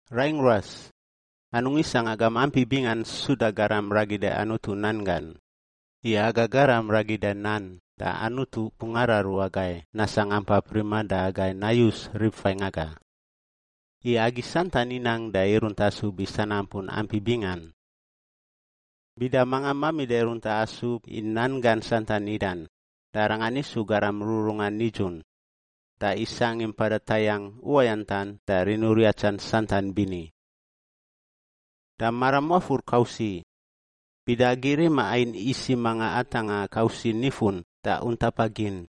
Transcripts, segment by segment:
Raingꞌ ruas, anungꞌ isangꞌ agam ampi bingan suda garam ragida Anutu nan gan, i aga garam ragida nan da Anutu bungꞌ araru agai nasangꞌ ampap riman da agai nayus rib faingꞌ aga. I agi santan inang da irunt asub i sanampun ampi bingan. Bida manga mamida i runta asub i nan gan santan nidan, da arangan isu garam rururungan nidzun da isangꞌ i mpada tayangꞌ uwayantan da riniuriatsan santan bini. Da maram wafur kausiꞌ, bida agi rima ain isiꞌ manga atangꞌa kausiꞌ nifun da untapa gin,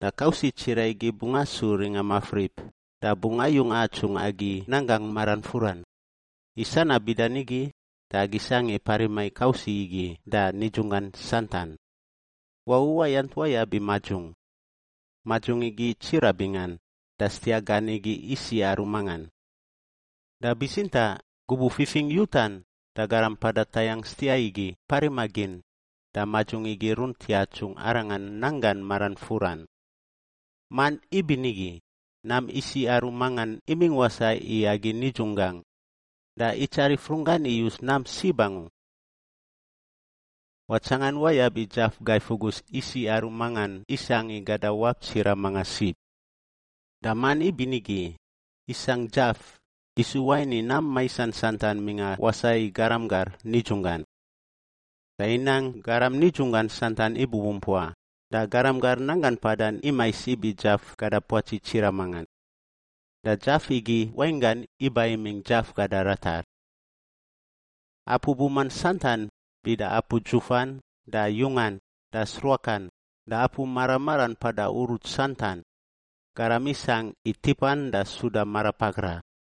da kausiꞌ tsiraꞌ igi bungꞌ asu ringa mafrip da bungꞌ ayung atsungꞌ agi nanggangꞌ marangꞌ furan. I sanab bida nigi da agi sangꞌ i parima i kausiꞌ igi da nidzunggan santan. Wau uwayant wayab i madzung. Madzung igi tsiraꞌ bingan da stiaꞌ gan igi isiꞌ aru mangan. Da bitsintaꞌ, gubuꞌ fifingꞌ yutan da garam mpada tayangꞌ stiaꞌ igi parima gin, da madzung igi irunt yatsungꞌ arangan nanggan maran furan. Man ibinigi, nam isiꞌ aru mangan imingꞌ wasaꞌ i agi nidzunggangꞌ, da itsarif runggan iyus nam sib angu. Watsangan wayab i dzaf gai fugus isiꞌ aru mangan isangꞌ i gada wap tsiraꞌ manga sib. Da man ibinigi, isangꞌ dzaf, isu wain i nam maisan santan mingꞌa wasaꞌ i garam gar nidzunggan. Da inang garam nidzunggan santan ibubumpua da garam gar nanggan mpadan imais ibi dzaf gada puatsi tsiraꞌ mangan. Da dzaf igi wainggan iba imingꞌ dzaf gada ratar. Apu buman santan bida apu dzufan da yungan da sruakan da apu mara maran mpada uruts santan, garam isangꞌ i tipan da suda marapakra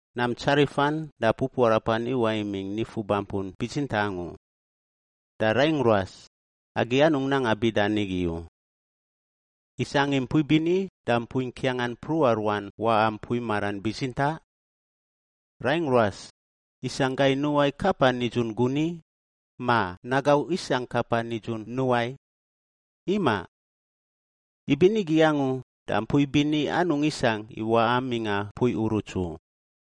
Nam tsarifan da pupuarapan iwaꞌ imingꞌ nifu bampun bitsintaꞌ angu. Da raingꞌ ruas, agi anungꞌ nanga bida nigi u! Isangꞌ i mpui bini da mpui ngkiangan mpruꞌa ruan waꞌa mpui maran bitsintaꞌ? Raingꞌ ruas, isangꞌ gai nuwai kapa nidzun guniꞌ, ma nagauꞌ isangꞌ kapa nidzun nuwai? Imaꞌ! Ibinigi angu da mpui bini anungꞌ isangꞌ i waꞌa mingꞌa mpui uruts u.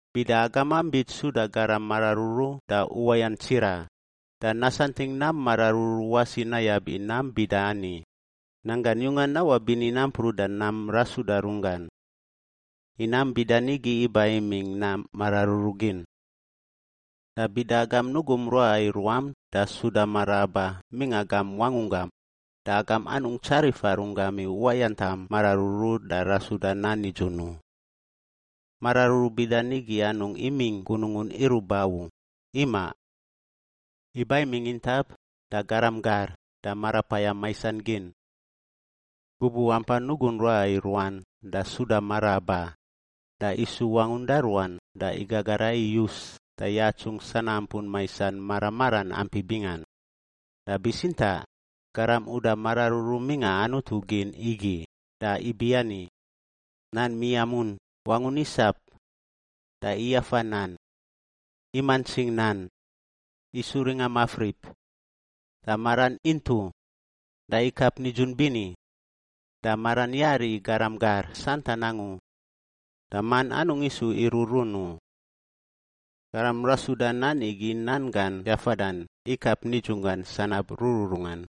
Bida agamam bits suda garam mararuru da uwayant tsiraꞌ, da nasantingꞌ nam mararuru wasi nayab i nam bida ani, nanggan yungan nawaꞌ bini nampruꞌ da nam rasuda runggan. I nam bida nigi iba imingꞌ nam mararuru gin. Da bida agam nugum ruaꞌa i ruam da suda mara aba mingꞌa gam wangunggam, da agam anungꞌ tsarifa runggam i uwayantam mararuru da rasuda nan nidzun u. Mararuru bida nigi anungꞌ imingꞌ gunungun iruꞌ ba u, ima! Iba imingꞌ intap da garam gar da marapayam maisan gin. Gubuꞌ ampan nugun ruaꞌa i ruan da suda mara aba, da isu wangun da ruan da igagara iyus da yatsungꞌ sanampun maisan mara maran ampi bingan. Da bitsintaꞌ garam uda mararuru mingꞌa Anutu gin igi da ibiani, nan miamun wangun isap, da iyafa nan, imantsing nan, isu ringa mafrip, da maran intuꞌ da ikap nidzun bini, da maran yari i garam gar santan angu da man anungꞌ isu iruꞌrun u. Garam rasuda nan igi nan gan yafadan ikap nidzunggan sanab rururungan.